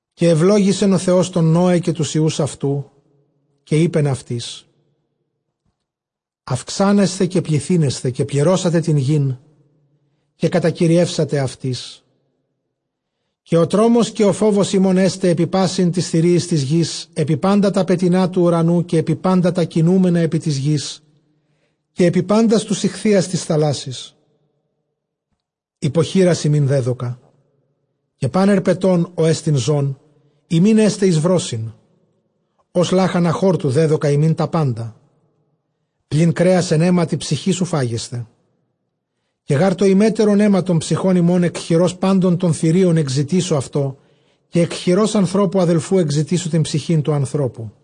Καὶ εὐλόγησεν ὁ Θεὸς τὸν Νῶε, καὶ τοὺς υἱοὺς αὐτοῦ· καὶ εἶπεν αὐτοῖς· αὐξάνεσθε καὶ πληθύνεσθε, καὶ πληρώσατε τὴν γῆν, καὶ κατακυριεύσατε αὐτῆς. Καὶ ὁ τρόμος, καὶ ὁ φόβος ὑμῶν, ἔσται ἐπὶ πᾶσι τοῖς θηρίοις τῆς γῆς, ἐπὶ πάντα τὰ πετεινὰ τοῦ οὐρανοῦ, καὶ ἐπὶ πάντα τὰ κινούμενα ἐπὶ τῆς γῆς, καὶ ἐπὶ πάντας τοὺς ἰχθύας τῆς θαλάσσης· ὑπὸ χεῖρας ὑμῖν δέδωκα. Καὶ πᾶν ἑρπετὸν, ὅ ἐστι ζῶν, ὑμῖν ἔσται εἰς βρῶσιν· ὡς λάχανα χόρτου δέδωκα ὑμῖν τὰ πάντα. Πλὴν κρέας ἐν αἵματι ψυχῆς οὐ φάγεσθε. Καὶ γὰρ τὸ ὑμέτερον αἷμα τῶν ψυχῶν ὑμῶν ἐκ χειρὸς πάντων τῶν θηρίων ἐκζητήσω αὐτό· καὶ ἐκ χειρὸς ἀνθρώπου ἀδελφοῦ ἐκζητήσω τὴν ψυχὴν τοῦ ἀνθρώπου.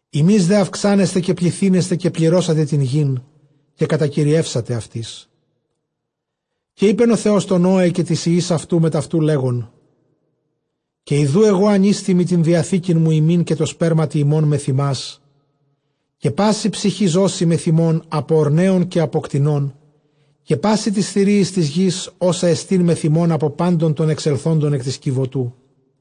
Ὑμεῖς δὲ αὐξάνεσθε, καὶ πληθύνεσθε, καὶ πληρώσατε τὴν γῆν, καὶ κατακυριεύσατε αὐτῆς. Καὶ εἶπεν ὁ Θεὸς τῷ Νῶε καὶ τοῖς υἱοῖς αὐτοῦ, μετʼ αὐτοῦ λέγων, καὶ ἰδοὺ ἐγὼ ἀνίστημι τὴν διαθήκην μου ὑμῖν, καὶ τῷ σπέρματι ὑμῶν μεθʼ ὑμᾶς, καὶ πάσῃ ψυχῇ ζώσῃ μεθʼ ὑμῶν, ἀπὸ ὀρνέων, καὶ ἀπὸ κτηνῶν· καὶ πᾶσι τοῖς θηρίοις τῆς γῆς, ὅσα ἐστὶ μεθʼ ὑμῶν ἀπὸ πάντων τῶν ἐξελθόντων ἐκ τῆς κιβωτοῦ.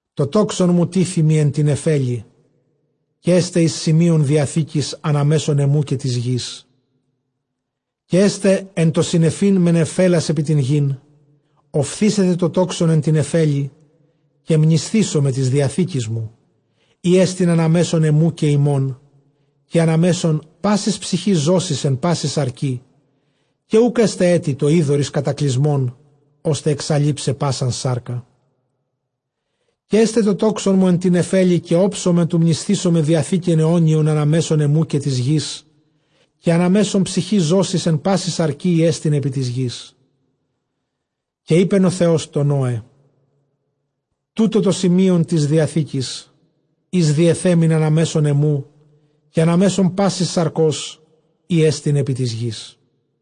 Τὸ τόξον μου τίθημι ἐν τῇ νεφέλῃ, καὶ ἔσται εἰς σημεῖον διαθήκης ἀνὰ μέσον ἐμοῦ καὶ τῆς γῆς. Καὶ ἔσται ἐν τῷ συννεφεῖν με νεφέλας ἐπὶ τὴν γῆν, ὀφθήσεται τὸ τόξον ἐν τῇ νεφέλῃ. Καὶ μνησθήσομαι τῆς διαθήκης μου, ἥ ἐστιν ἀνὰ μέσον ἐμοῦ καὶ ὑμῶν, καὶ ἀνὰ μέσον πάσης ψυχῆς ζώσης ἐν πάσῃ σαρκί· καὶ οὐκ ἔσται ἔτι τὸ ὕδωρ εἰς κατακλυσμὸν, ὥστε ἐξαλεῖψαι πᾶσαν σάρκα. Καὶ ἔσται τὸ τόξον μου ἐν τῇ νεφέλῃ· καὶ ὄψομαι τοῦ μνησθῆναι διαθήκην αἰώνιον ἀνὰ μέσον ἐμοῦ καὶ τῆς γῆς, καὶ ἀνὰ μέσον ψυχῆς ζώσης ἐν πάσῃ σαρκὶ, ἥ ἐστιν ἐπὶ τῆς γῆς. Καὶ εἶπεν ὁ Θεὸς τῷ Νῶε, τοῦτο τὸ σημεῖον τῆς διαθήκης, ἧς διεθέμην ἀνὰ μέσον ἐμοῦ, καὶ ἀνὰ μέσον πάσης σαρκὸς, ἥ ἐστιν ἐπὶ τῆς γῆς.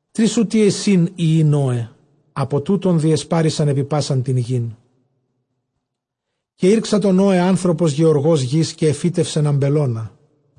Τρεῖς οὗτοί εἰσιν υἱοὶ Νῶε· ἀπὸ τούτων διεσπάρησαν ἐπὶ πᾶσαν τὴν γῆν. Καὶ ἤρξατο Νῶε ἄνθρωπος γεωργὸς γῆς, καὶ ἐφύτευσεν ἀμπελῶνα.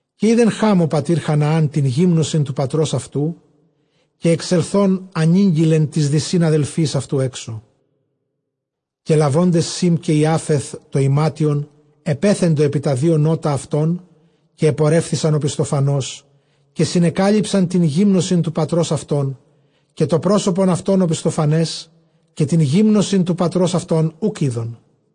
Καὶ εἶδε Χὰμ ὁ πατὴρ Χαναὰν τὴν γύμνωσιν τοῦ πατρὸς αὐτοῦ, καὶ ἐξελθὼν ἀνήγγειλε τοῖς δυσὶν ἀδελφοῖς αὐτοῦ ἔξω. Καὶ λαβόντες Σὴμ καὶ Ἰάφεθ τὸ ἱμάτιον, ἐπέθεντο ἐπὶ τὰ δύο νῶτα αὐτῶν, καὶ ἐπορεύθησαν ὀπισθοφανῶς, καὶ συνεκάλυψαν τὴν γύμνωσιν τοῦ πατρὸς αὐτῶν· καὶ τὸ πρόσωπον αὐτῶν ὀπισθοφανῶς, καὶ τὴν γύμνωσιν τοῦ πατρὸς αὐτῶν οὐκ εἶδον.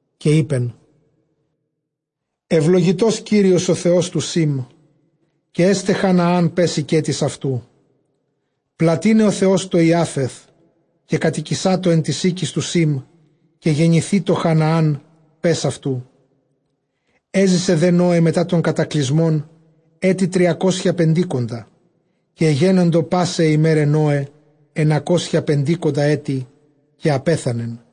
Καὶ εἶπεν, εὐλογητὸς Κύριος ὁ Θεὸς τοῦ Σήμ· καὶ ἔσται Χαναὰν παῖς οἰκέτης αὐτοῦ. Πλατύναι ὁ Θεὸς τῷ Ἰάφεθ, καὶ κατοικησάτω ἐν τοῖς οἴκοις τοῦ Σήμ· καὶ γενηθήτω Χαναὰν παῖς αὐτοῦ. Ἔζησε δὲ Νῶε μετὰ τὸν κατακλυσμὸν ἔτη τριακόσια πεντήκοντα. Καὶ ἐγένοντο πᾶσαι αἱ ἡμέραι Νῶε ἐννακόσια πεντήκοντα ἔτη· καὶ ἀπέθανεν.